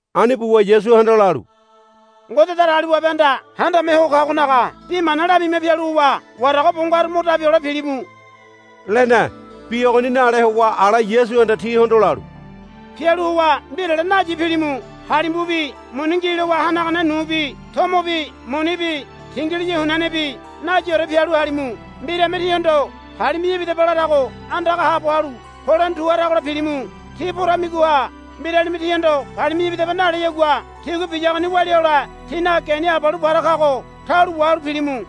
Ani buwa Yasuhanda lalu, Ngode Datagaliwabehanda Handame Ho Kagonaga bi mana lamima pialu howa warago bo ngaru mo dabi hole pilimu, lene. Bi ogoni nale howa ala Yasuhanda tihondo lalu, Pialu howa mbirale nayi pilimu. Halimbubi muni ngi lowa hanagane nubi tomobi munibi tingiliya hunianebi nayiore pialu halimu. Mbirame tíhondo, Palimi̱ya ibidaba, larago andaga haabo halu polene tu haragola pilimu. Tí poramigoha mbiralime tíhondo, Palimi̱ya ibidaba, naleyagua tigua biyagoni walia hole tínaga geni abalu para kago taulo wahalu pilimu,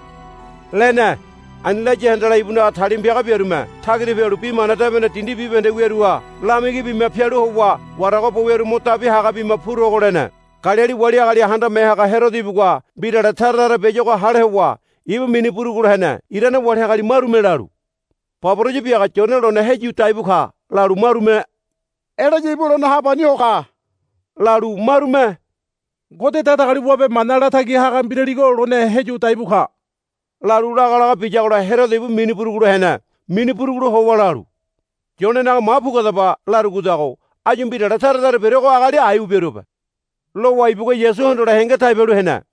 lene. Ani laya handala ibunaga talima piaga biarume tagira pialu Bi Mana Debene dindi bibahende wiaruha lamigi bima pialu howa warago bo wiaru mo dabi haga bima purogo lene. Galili wali agali handame haga Herodo ibugua mbirale tara tara biayuago hale howa ibu mini burugulo hene. Irane wali agali marume lalu, Baboraya biaga Yone lone heyu daibu ka, lalu marume Elaya ibu lone ha pani ho ka, lalu marume, Ngode Datagaliwabe mana latagi haga mbiraligo lone heyu daibu ka, lalu lagalaga biyagola Herodo ibu mini burugulo hene. Mini burugulo howa lalu, Yonenaga ma puguadaba, larugodago áyu mbirale tara tara biaruago agali aiwa biaruabe, lowa ibugua Yasu hondole henge tai bialu hene.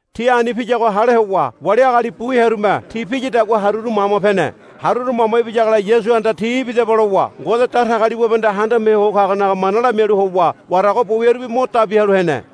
Ti ani piyago hale howa wali agali bu hearume ti piyadagua haruru mama pene. Haruru mama ibiyagola Yasuhanda, Tí ibidaba, lowa Ngode Datagaliwabehanda Handame Ho Kagonaga mana lamialu howa warago bo wiarubi mo dabi halu hene.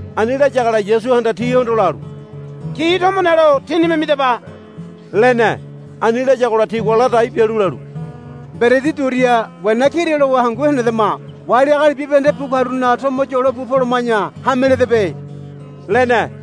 Ani layagola Yasuhanda tihondo lalu, Ti tomo nelo tínime midaba, lene. Ani layagola tigua ladai bialu lalu, Mberedi duria wena kira lowa hangu henedama. Wali agali bibahende bu karunaga tomo yolo bu poloma̱ya hameledebe, lene.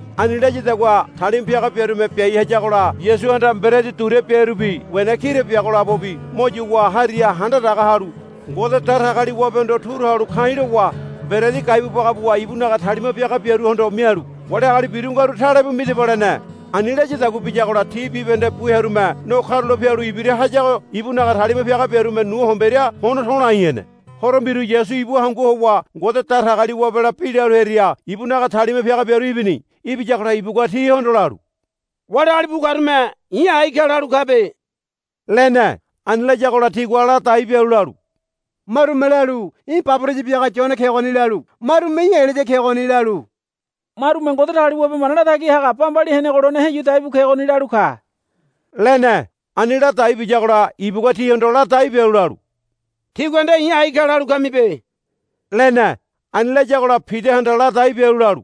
Ani layadagua talima piaga biarume biai hayagola Yasuhanda mberedi duria biarubi wena kira biago labobi mo yuwa hariha handa daga halu Ngode Datagaliwabehondo turu halu ka̱i̱ lowa mberedi gaibu baga buwa ibunaga talima piaga biaruhondo mialu, Wali agali biru ngaru talebu midaba, lene. Ani layadagua biyagola ti bibahende bu hearume no karula pialu ibira hayago ibunaga talima piaga biarume nu homberia hono to̱lai hene. Horo mbiru Yasu ibu hangu howa Ngode Datagaliwabela bi lalu hearia ibunaga talima piaga biaru ibini. Ibiyagola ibugua tihondo lalu, Wali agali bu karume i̱ ai ka lalu kabe, lene. Ani layagola tigua ladai bialu lalu, Marume lalu, Í̠ baboraya biaga Yone kegoni, lalu marume, Í̠ Elaya kegoni, lalu marume, Ngode Datagaliwabe mana latagi haga bambali henego lone heyu daibu kegoni, lalu ka, lene. Ani ladai biyagola ibugua tihondo ladai bialu lalu, Tígua nde i̱ ai ka lalu kamibe, lene. Ani layagola Pidahanda ladai bialu lalu,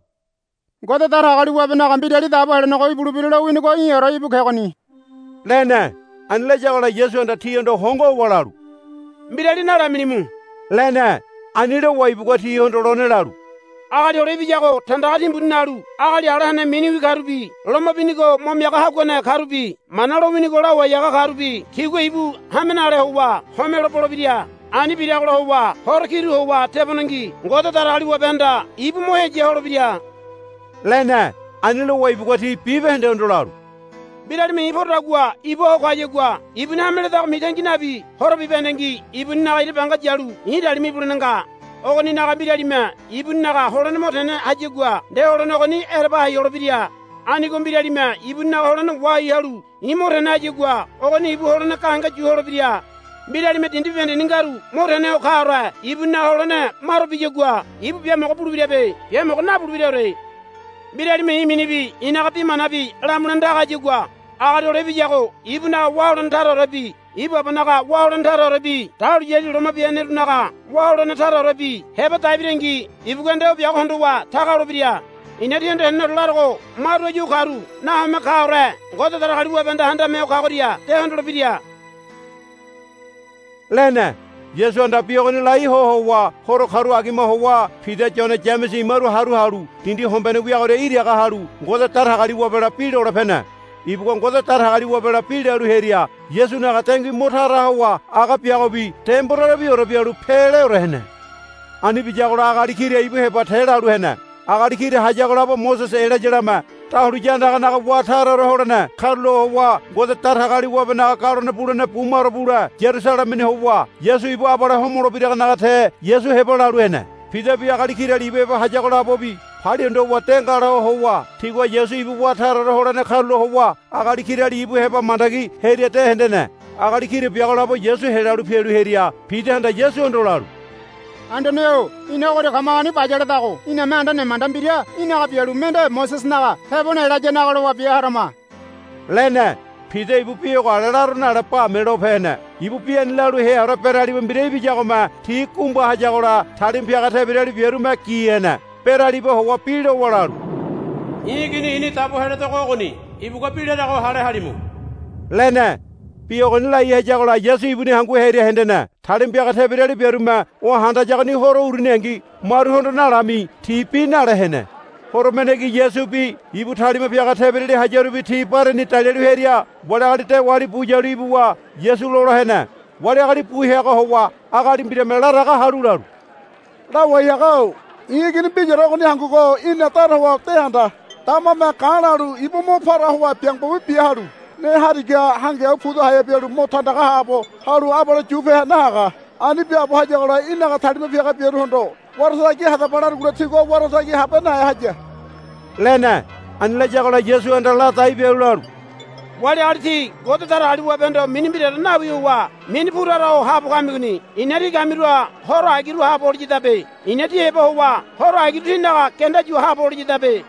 Ngode Datagaliwabenaga Mbirali Dabo Helenego ibulebira lowinigo í̠ore íbu kegoni, lene. Ani layagola Yasuhanda tihondo hongo howa lalu, Mbirali nalamilimu, lene. Ani lowa ibugua tihondo lone lalu, Agali Hole Ibiyago tandaga timbuni nalu agali ala hene miniwi karubi loma binigo mo miaga haguane karubi Mana lowinigo lawai haga karubi tigua ibu hame nale howa homelo bolebira. Ani biragola howa horo kiru howa tebonengi Ngode Datagaliwabehanda ibu mo heya holebira, lene. Ani lowa ibugua ti bibahendehondo lalu, Mbiralime i̱ porodagua ibua ho kayagua ibuni hame ledago mitangi nabi horo bibahendengi ibuninaga ira banga yalu i̱ talima ibulene nga. Ogoninaga mbiralime ibuninaga holene mo tene hayagua nde holene ogoni ereba hai holebira. Anigo mbiralime ibuninaga holene wahai halu i̱ mo tene hayagua ogoni ibu holene gahenge yu holebira. Mbiralime dindi bibahendeni ngaru mo tene ho kaore ibuninaga holene maro biyagua ibu biamogo bulebirabe. Biamogo nabulebiraore. Mbiralime i̱ minibi i̱naga bi manabi lamulene taga hayagua Agali Hole Ibiyago ibunaga wá holene taraorebi ibu Abanaga wá holene taraorebi dahuliyali loma bia henerunaga wá holene taraorebi heba dai birangi ibugua nde o biago hondowa taga holebira. I̱na tíhondo heneneore larogo maru áyu ogoria karu nahome kaore Ngode Datagaliwabehanda Handame Ho Kagoria de hondolebira, lene. Yasuhanda bi ogoni lai ho howa horo karu agima howa Pida Yone Yamese imaru haru halu dindi hombene wiagoria iraga halu Ngode Datagaliwabela bi lole pene. Ibugua Ngode Datagaliwabela bi lalu hearia Yasunaga dengui mo tara howa aga biagobi demborere bialu peleore hene. Ani biyagola agali kira ibu heba te lalu hene. Agali kira hayago labo Mosese Elayalame dahuliya andaganaga wá taraore holene karulo howa Ngode Datagaliwabenaga galone bulene bumaro bule Yarusalemeni howa Yasu ibu abale homolebiragonaga te Yasu heba lalu hene. Pidabi agali kirali ibu heba hayago labobi palia hondo howa de ngala howa tigua Yasu ibu wá taraore holene karulo howa agali kirali ibu heba mandagi hearia de hendene. Agali kira biago labo Yasu helalu pialu hearia Pidahanda Yasuhondo lalu, Anduane-o ina ogoria kamagoni bayaledago. Iname anda nemanda mbira í̠naga bialu mende Mosesenaga tebone Elayanaga lowa bia harama, lene. Pida ibu bi ogo ale laro nale bame lope hene. Ibu bi lalu heaore beraliba mbira ibiyagome ti gumba hayagola talima piaga tebirali biarume gi hene. Beralibaha howa bi lowa lalu, I̱ Igini i̱ni dabo heledogo ogoni. Ibugua bi larago hale halimu, lene. Bi ogoni lai hayagola Yasu ibuni hangu hearia hendene. Talima piaga tebirali biarume o handayagoni horo uruningi maruhondo nalami ti bi nale hene. Horo mendengi Yasubi ibu talima piaga tebirali hayarubi ti bareni dalialu hearia wali agali dewali bu yalu ibuwa Yasu lola hene. Wali agali bu heagoha howa agali mbirame laraga halu lalu, Lawai haga-o i̱ igini mbiraore ogoni hangugo í̠na dara howa de handa. Damame ga̱ lalu ibu mo para howa biango bibi bia halu ne harigaha hangiau puda haea bialu mo tandaga haabo halu abale yu pe nahaga. Ani biaabo hayagola í̠naga talima piaga biaruhondo, Wara tagi hadaba, larugola tigua wara tagi habe nahe haya, lene. Ani layagola Yasuhanda ladai bialu lalu, Wali agali tí Ngode Datagaliwabehondo mini mbiraore nawi howa mini pu tara ho haabo kamigoni. I̱na tí kamiruha horo agiru haabo holiyadabe. I̱na tí heba howa horo agiru tínaga genda yu haabo holiyadabe,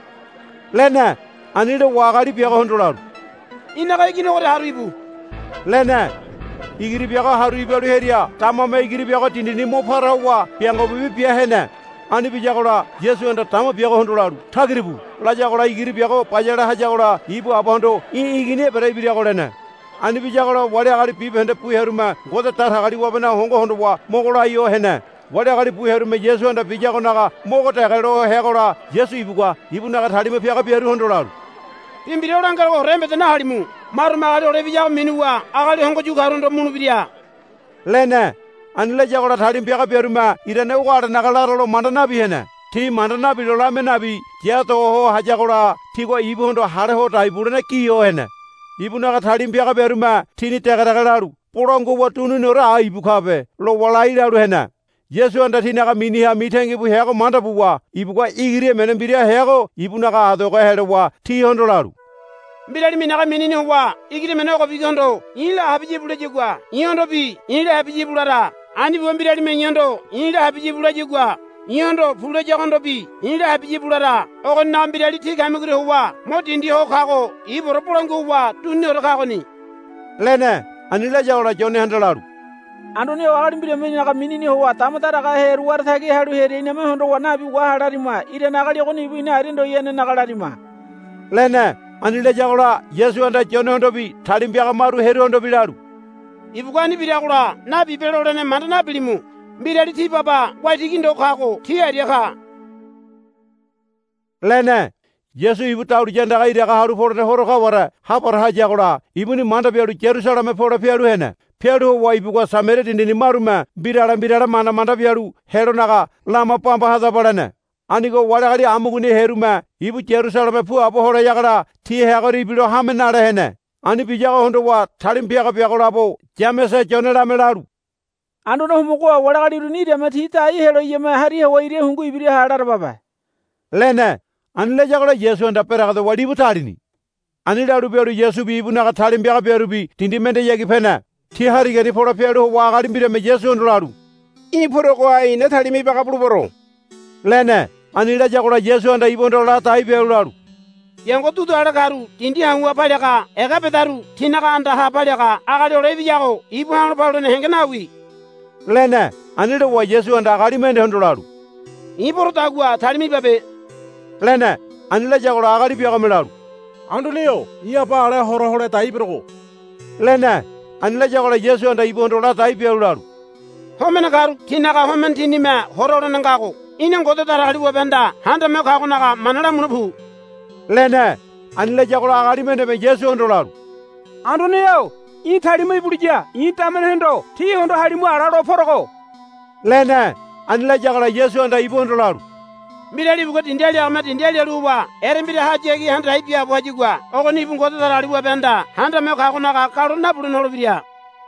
lene. Ani lowa agali biagohondo lalu, Í̠naga igini ogoria haru íbu, lene. Igiri biago haru ibalu hearia damame igiri biago dindini mo para howa biango bibi bia hene. Ani biyagola Yasuhanda dama biagohondo lalu, Tagira pu, layagola igiri biago bayale hayagola ibu abahondo, Í̠ igini ebere ibirago, lene. Ani biyagola wali agali bibahende bu hearume Ngode Datagaliwabenaga hongo hondowa mogo lai ho hene. Wali agali bu hearume Yasuhanda biyagonaga mogo dege lo heagola Yasu ibugua ibunaga talima piaga biaruhondo lalu, Bi mbira o langerogoore embeda nahalimu. Marume Agali Hole Ibiyago minuwa agali hongo yu karuhondo mulebira, lene. Ani layagola talima piaga biarume irane ogo alenaga laralo manda nabi hene. Ti manda nabilo lamia nabi ya do ho hayagola tigua ibuhondo hale hodai bulene giho hene. Ibunaga talima piaga biarume tini dege dege lalu, Bolangua howa duniniore ai ibu kabe, lowa lai lalu hene. Yasuhanda tinaga miniha mitangibu heago manda buwa ibugua igiri emene mbira heago ibu adogeha helowa tihondo lalu, Mbiralime i̱naga minini howa igiri emene ogobigohondo, I̱la habiya íbu, layagua i̱hondobi, I̱la habiya íbu, lara. Ani buwa mbiralime i̱hondo, I̱la habiya íbu, layagua i̱hondo, Pu, layagohondobi, I̱la habiya íbu, lara. Ogoninaga mbirali tí kamigoria howa mo dindi ho kago ibuore bolangua howa duniniore kagoni, lene. Ani layagola Yonehanda lalu, Anduane-o agali mbirame í̠naga minini howa dama daraga hearu wara tagi halu hearia iname hondowa, Nabi waha, lamirima. Irane agali ogoni ibu ina aria ndoyanenaga lamirima, lene. Ani layagola Yasuhanda Yonehondobi talima piaga maru hearuhondobi lalu, Ibugua ani biragola, Nabibe, lole manda nabilimu. Mbirali tí baba waitigi ndo kago tí aria ka, lene. Yasu ibu dahuliya andaga iraga halu polene horo kaware ha para hayagola ibuni manda bialu Yarusaleme pole pialu hene. Pialu howa ibugua Samaria dindini marume mbirale mbirale manda manda bialu helonaga, Lama bamba hadaba, lene. Anigo wali agali amugoniha hearume ibu Yarusaleme puabo holeyagola ti hearia ibilo hame nale hene. Ani biyago hondowa talima piaga biagolabo Yamese Yonelame lalu, Anduane Homogo-o wali agali uruni irame ti dai helo iyame hariha howa ira hungu ibiraha larababe, lene. Ani layagola Yasuhanda beregedowa libu talini. Ani lalu bialu Yasubi ibunaga talima piaga biarubi dindi mendehayagi pene. Ti harigani pole pialu howa agali mbirame Yasuhondo lalu, Í̠ poregoha i̱na talima ibaga bulebero, lene. Ani layagola Yasuhanda ibuhondo ladai bialu lalu, Biango dudu ale karu dindi hau̱ha paliaga ega bedaru tinaga andaha paliaga Agali Hole Ibiyago ibu ha̱lo paluene henge nawi, lene. Ani lowa Yasuhanda agali mendehondo lalu, I̱ porodagua talima ibabe, lene. Ani layagola agali biagome lalu, Anduane-o i̱ aba ala hora hole dai berogo, lene. Ani layagola Yasuhanda ibuhondo ladai bialu lalu, Homene karu tinaga homene tinime hora holene ngago. Í̠na Ngode Datagaliwabehanda Handame Ho Kagonaga mana lamule pu, lene. Ani layagola agali mendeme Yasuhondo lalu, Anduane-o í̠ talima ibuliya i̱ damenehondo, Tí hondo halimu, ala lo porogo, lene. Ani layagola Yasuhanda ibuhondo lalu, Mbirali ibugua dindi aliagame dindi alialu howa erembirahayagi handa dai biaabo hayagua ogoni ibu Ngode Datagaliwabehanda Handame Ho Kagonaga galone nabulene holebira.